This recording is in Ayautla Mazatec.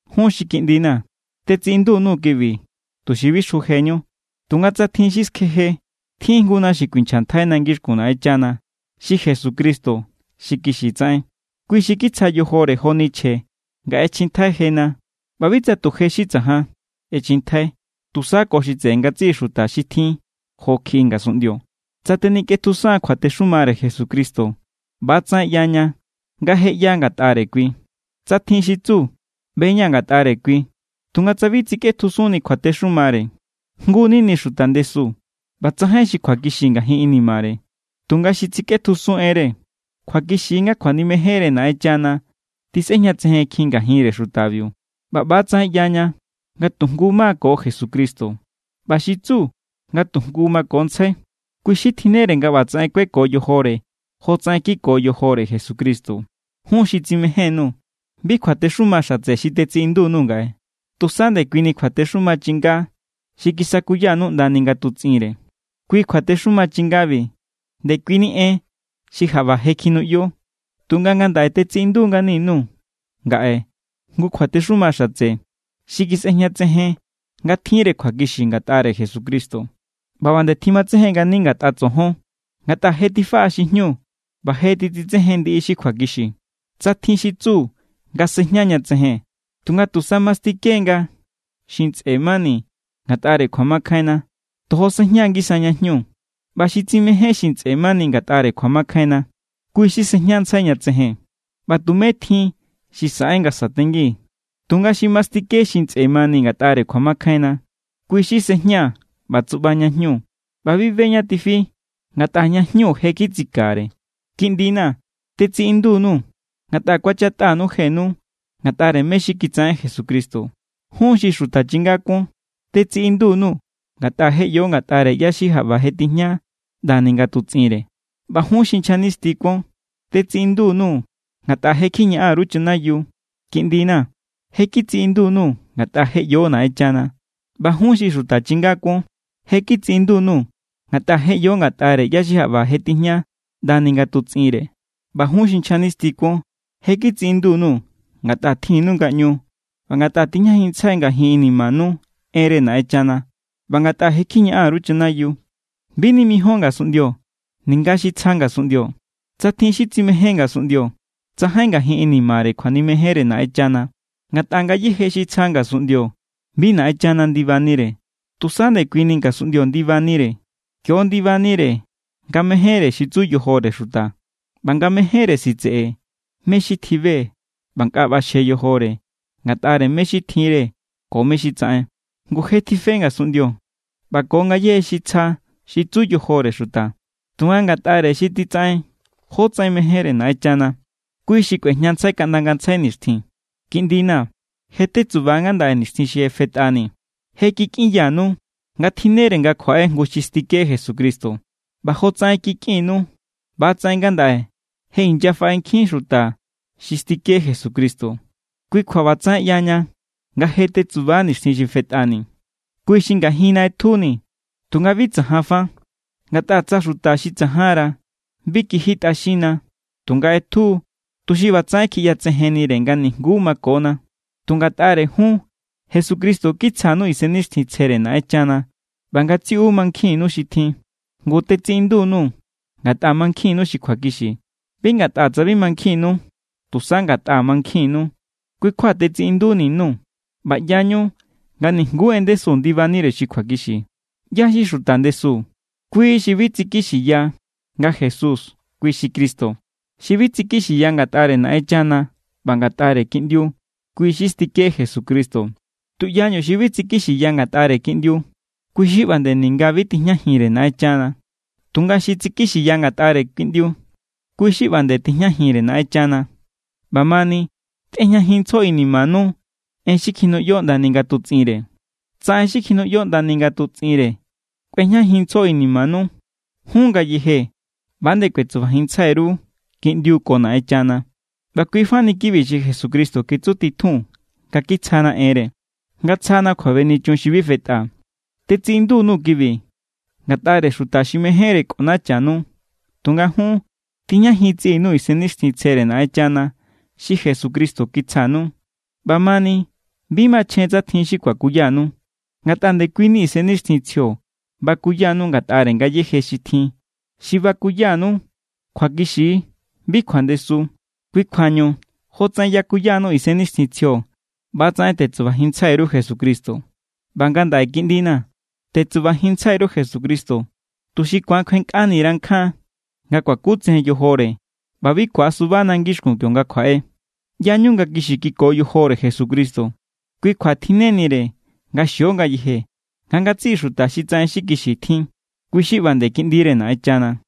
Jun xi kiꞌndina̱, tetsiꞌindu_nuu̱ kibi tuxi bi xjujeñu. Tunga tsa tjin xi skjeje, tjin=jnguna xi kuinchjantjaina ngixkun Naꞌenchana, xi Jesucristo xi kixi tsaꞌen. Kui xi kitsja yojore joni chje nga ꞌechjintjai jena. ꞌBa bi tsa tu je xi tsajan ꞌechjintjai, tusa ko xi tseꞌe ngatsiꞌi xuta xi tjin jo kjiꞌi ngasunꞌndio. Tsa tenikꞌetjusan kjuatexumare Jesucristo, ꞌba=tsaꞌen ꞌyaña nga je ꞌya ngatꞌare kui. Tsa tjin xi tsu: “ꞌBe=ña̱ ngatꞌare kui”, tunga tsa bi tsikꞌetjusunni kjuatexumare, jngu=nini xuta ndesu ꞌba tsajain xi kjuakixi ngajin inimare. Tunga xi titsikꞌetjusun enre, kjuakixi= nga kjuanimejenre Naꞌenchana tisꞌejñatsejenkjin ngajinre xutabiu. ꞌBa ꞌba=tsaꞌen ꞌyaña nga tu jngu= ma= ko Jesucristo. ꞌBa xi tsu nga tu jngu makontsjai, kui xi tjinnere nga ꞌbatsaꞌen kueko yojore jotsaꞌen kiko yojore Jesucristo. Jun xi tsimején_nuu̱, bi kjuatexuma xatse xi tetsiꞌindu_nuu̱ ngaꞌe, tusa ndekuini kjuatexuma chinga xi kisakuyanu ꞌndani ngatutsꞌinre. Kui kjuatexuma chingabi, ndekuini en xi jaꞌba je kjinuꞌyo. Tunga ngandaꞌe tetsiꞌindu ngani_nuu̱ ngaꞌe jngu kjuatexuma xatse xi kjisꞌejñatsejen nga tjinre kjuakixi ngatꞌare Jesucristo, ꞌba ꞌba nde tjimatsejen ngani ngatꞌa tsojon, ngatꞌa je tifaꞌa xi jñu ꞌba je titsitsejen ndiꞌi xi kjuakixi. Tsa tjin xi tsu nga sejña ña tsejen, tunga tusa mastike=nga xi ntsꞌe mani ngatꞌare kjuamakjainna, tojo sejña=ngisa ña jñu. ꞌBa xi tsimején xi ntsꞌe mani ngatꞌare kjuamakjainna, kui xi sejñantsjai ña tsejen, ꞌba tumé tjin xi saꞌen nga satengi. Tunga xi mastike xi ntsꞌe mani ngatꞌare kjuamakjainna, kui xi sejña ꞌba tsuꞌba ña jñu, ꞌba bi be ñá tifi, ngatꞌa ña jñu je= kitsikare. Kiꞌndina̱, tetsiꞌindu_nuu̱ ngatꞌa kuachatꞌanu jenu ngatꞌare mé= xi kitsaꞌen Jesucristo. Jun xi xuta chinga kuon, tetsiꞌindu_nuu̱ ngatꞌa je ꞌyo ngatꞌare ꞌyá= xi jaꞌba je tijña ꞌndani ngatutsꞌinre. ꞌBa jun xi nchja nisti kuon, tetsiꞌindu_nuu̱ ngatꞌa je kjiñaꞌan_ru chanayiu. Kiꞌndina̱, je kitsiꞌindu_nuu̱ ngatꞌa je ꞌyo Naꞌenchana. ꞌBa jun xi xuta chinga kuon, je kitsiꞌindu_nuu̱ ngatꞌa je ꞌyo ngatꞌare ꞌyá= xi jaꞌba je tijña ꞌndani ngatutsꞌinre. ꞌBa jun xi nchja nisti kuon, je kitsiꞌindu_nuu̱ ngatꞌa tjinnu ngaꞌñu ꞌba ngatꞌa tijñajinntsjai ngajin inimanu enre Naꞌenchana ꞌba ngatꞌa je kjiñaꞌan_ru chanayiu. Bi nimijíon ngasunꞌndio ninga xi tsja ngasunꞌndio. Tsa tjin xi tsimején ngasunꞌndio, tsajain ngajin inimare kjuanimejenre Naꞌenchana. Ngatꞌa ngayéje xi tsja ngasunꞌndio bi Naꞌenchana ndibanire, tusa ndekuini ngasunꞌndio ndibanire. Kio= ndibanire nga mejénre xi tsu yojore xuta, ꞌba nga mejénre sitseꞌe mé= xi tjibe ꞌba nga nkꞌa ꞌbaxje yojore ngatꞌare mé= xi tjinre ko mé= xi tsaꞌen. Ngu je tife ngasunꞌndio ꞌba ko ngayéje xi tsja xi tsu yojore xuta, tunga ngatꞌare xi titsaꞌen jotsaꞌen mejénre Naꞌenchana, kui xi kꞌuejñantsjai kaꞌnda ngantsjai nixtjin. Kiꞌndina̱, je tetsuba ngandaꞌe nixtjin xi je fetꞌani. Je kikꞌinyanu nga tjinnere nga kjuaꞌe jngu xi stike Jesucristo, ꞌba jotsaꞌen kikꞌinnu ꞌbatsaꞌen ngandaꞌe je inyafaꞌe nkjin xuta xi stike Jesucristo. Kui kjua ꞌbatsaꞌen ꞌyaña nga je tetsuba nixtjin xi fetꞌani. Kui xi ngajinna ꞌetjuni, tunga bi tsajan fa. Ngatꞌa tsa xuta xi tsajanra, bi kijitꞌaxinna. Tunga ꞌetju=, tuxi ꞌbatsaꞌen kjiꞌyatsejennire nga nijnguú makona. Tunga ngatꞌare jun, Jesucristo kitsjanu Isennixtjintsjere Naꞌenchana ꞌba ngatsiꞌu mankjinnu xi tjin. Ngu tetsiꞌindu_nuu̱ ngatꞌa mankjinnu xi kjuakixi. Bi ngatꞌa tsa bi mankjinnu, tusa ngatꞌa mankjinnu, kui kjua tetsiꞌinduni_nuu̱. ꞌBa ꞌyañu nga nijnguú en ndesu ndibanire xi kjuakixi. ¿ꞌYá= xi xuta ndesu? Kui xi bi tsikixiya nga Jesús kui xi Cristo. Xi bi tsikixiya ngatꞌare Naꞌenchana ꞌba ngatꞌare Kiꞌndiu, kui xi stike Jesucristo. Tuꞌyañu xi bi tsikixiya ngatꞌare Kiꞌndiu, kui xi ꞌba nde ninga bi tijñajinre Naꞌenchana. Tunga xi tsikixiya ngatꞌare Kiꞌndiu, kui xi ꞌba nde tijñajinre Naꞌenchana. ꞌBamani, tꞌejñajinntsjo inimanu en xi kjinuꞌyo ꞌndani ngatutsꞌinre. Tsa en xi kjinuꞌyo ꞌnda ngatutsꞌinre kꞌuejñajinntsjo inimanu, jun ngayeje ꞌba=nde kuetsubajinntsjai_ru Kiꞌndiu ko Naꞌenchana. ꞌBa kuifa ni kibi xi Jesucristo kitsutitjun nga kitsjana enre: nga tsjana kjuabenichun xi bi fetꞌa. Tetsiꞌindu_nuu̱ kibi ngatꞌare xuta xi mejénre kꞌonachanu. Tunga jun, tijñajin tsiꞌinu Isennixtjintsjere Naꞌenchana xi Jesucristo kitsjanu. ꞌBamani bi machjen tsa tjin xi kuakuyanu, ngatꞌa ndekuini Isennixtjintsjio bakuyanu ngatꞌare ngayéje xi tjin. Xi bakuyanu kjuakixi=, bi kjuandesu. Kui kjuañu jotsaꞌen yakuyanu Isennixtjintsjio, ꞌba=tsaꞌen tetsubajinntsjai_ru Jesucristo. ꞌBa ngandaꞌe kiꞌndina̱, tetsubajinntsjai_ru Jesucristo, tuxi ku̱an kjuenkꞌanira nkjan nga kuakutsejen yojore ꞌba bi ku̱asubana ngixkun kionga kjuaꞌe. ꞌYañu nga kixi kiko yojore Jesucristo. Kui kjua tjinnenire nga xio ngayeje nga ngatsiꞌi xuta xi tsaꞌen xi kixi tjin, kui xi ꞌba nde kiꞌndire Naꞌenchana.